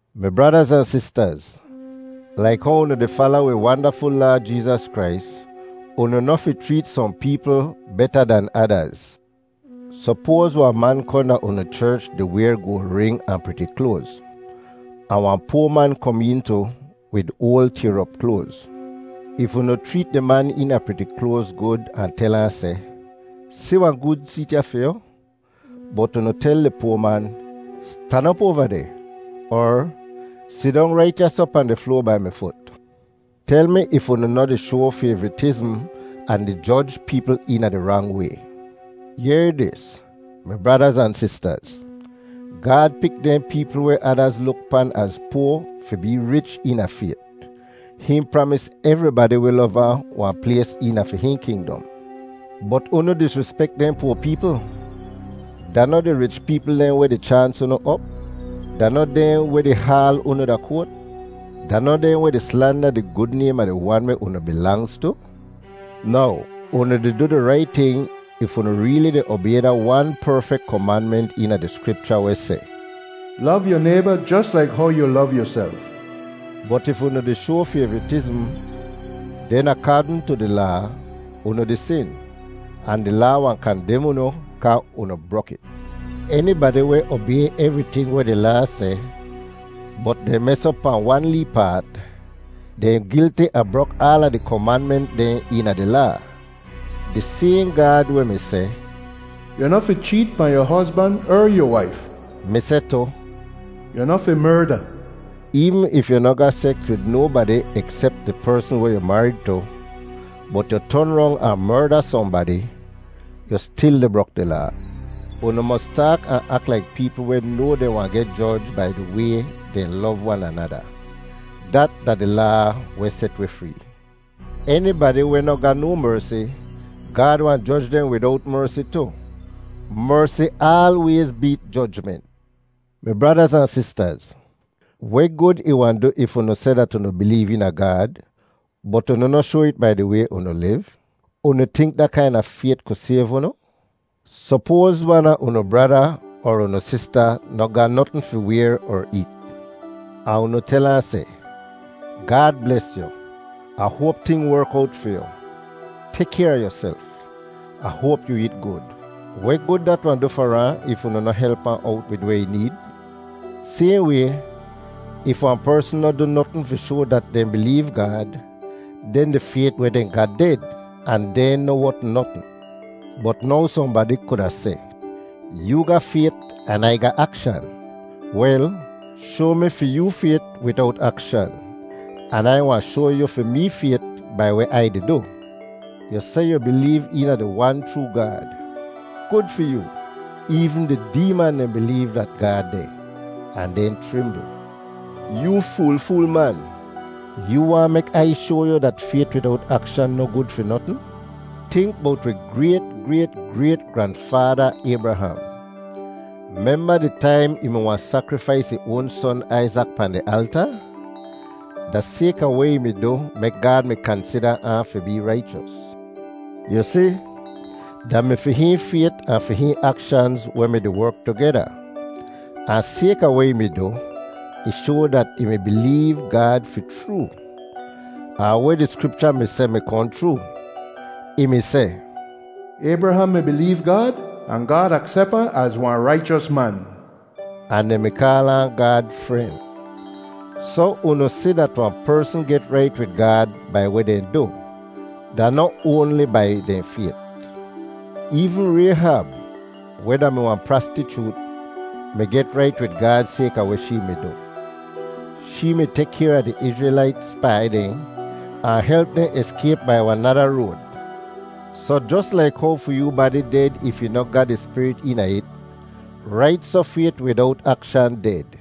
Mi bradaz ahn sistaz, laik how unu di fala wi wandaful Laad Jeezas Krais, unu noh fi chreet sohn peepl beta dan adaz. Sopoaz wahn man kohn da unu cherch di wayr goal ring ahn priti kloaz, ahn wahn poa man kom een tu wid oal tayr op kloaz. If unu chreet di man eena priti kloaz gud ahn tel ahn seh, “Si wahn gud seet ya fi yu,” bot unu tel di poa man, “Stan op oava deh,” er, “Sidong rait ya soh pahn di floa bai mi fut,” tel mi if unu noh di shoa fayvritizm ahn di joj peepl eena di rang way. Yehr dis, mi bradaz ahn sistaz: Gaad pik dehn peepl weh adaz luk pan az poa fi bee rich eena fayt. Hihn pramis evribadi weh lov ahn wahn plays eena fi hihn kingdom. Bot unu disrispek dehn poa peepl! Da noh di rich peepl dehn weh di chaans unu op? Da noh dehn weh di haal unu da koat? Da noh dehn weh di slanda di gud naym a di Wan weh unu bilangz tu? Now, unu di du di rait ting if unu reeli di obay da wan perfek komanment eena di Skripcha weh seh, “Lov yu nayba jos laik how yu lov yuself.” Bot if unu di shoa fayvritizm, den akaadn tu di Laa, unu di sin, ahn di Laa wahn kandem unu kaa unu brok it. Enibadi weh obay evriting weh di Laa seh bot dehn mes op pahn wan lee paat, dehn gilti a brok aala di komanment dehn eena di Laa. Di sayhn Gaad weh mi seh, “Yu noh fi cheet pahn yu hozban er yu waif,” mi seh tu, “Yu noh fi merda.” Eevn if yu noh ga seks wid nobadi eksep di persn weh yu marid tu, bot yu ton rong ahn merda sohnbadi, yu stil di brok di Laa. Unu mos taak ahn ak laik peepl weh noa dehn wahn geh joj bai di way dehn lov wan anada. Dat da di Laa weh set wi free. Enibadi weh noh ga no mersi, Gaad wahn joj dehn widowt mersi tu. Mersi aalwayz beet jojment! Mi bradaz ahn sistaz, weh gud ih wahn du if unu seh dat unu bileev eena Gaad, bot unu noh shoa it bai di way unu liv? Unu tink da kaina fayt ku sayv unu? Sopoaz wan a unu brada er unu sista noh ga notn fi wayr er eet, ahn unu tel ahn seh, “Gaad bles yu. Ah hoap ting werk owt fi yu. Tek kayr a yuself. Ah hoap yu eet gud.” Weh gud dat wahn du far ahn if unu noh help ahn owt wid weh ih need? Sayhn way, if wahn persn noh du notn fi shoa dat dehn bileev Gaad, den di fayt weh dehn ga ded, ahn dehn noh wot notn. Bot now sohnbadi kuda seh, “Yoo ga fayt an Ai ga akshan.” Wel, shoa mi fi yoo fayt widowt akshan, an Ai wahn shoa yu fi mee fayt bai weh Ai di du. Yu seh yu bileev eena di Wan chroo Gaad. Gud fi yoo! Eevn di deeman dehn bileev dat Gaad deh, ahn dehn chrimbl. Yoo fool-fool man. Yoo waahn mek Ai shoa yu dat fayt widowt akshan noh gud fi notn? Tink bowt wi grayt-grayt-grayt-granfaada Aybraham. Memba di taim ih mi wahn sakrifais ih oan son Aizak pahn di alta? Da sayka weh ih mi du mek Gaad mi kansida ahn fi bee raichos. Yu si, da mi fi hihn fayt ahn fi hihn akshanz weh mi-di werk tugeda. Ahn sayka weh ih mi du, ih shoa dat ih mi bileev Gaad fi chroo. Ahn weh di Skripcha mi seh mi kohn chroo. Ih mi seh, “Aybraham mi bileev Gaad, ahn Gaad aksep ahn az wahn raichos man,” ahn dehn mi kaal ahn Gaad fren. Soh unu si dat wahn persn get rait wid Gaad bai weh dehn du; da noh oanli bai dehn fayt. Eevn Rayhab, weh da-mi wahn prastichoot, mi get rait wid Gaad sayka weh shee mi du. Shee mi tek kayr a di Izrelait spai dehn ahn help dehn eskayp bai wahn nada road. Soh jos laik how fi yoo badi ded if ih noh ga di spirit eena it, rait soh fayt widowt akshan ded.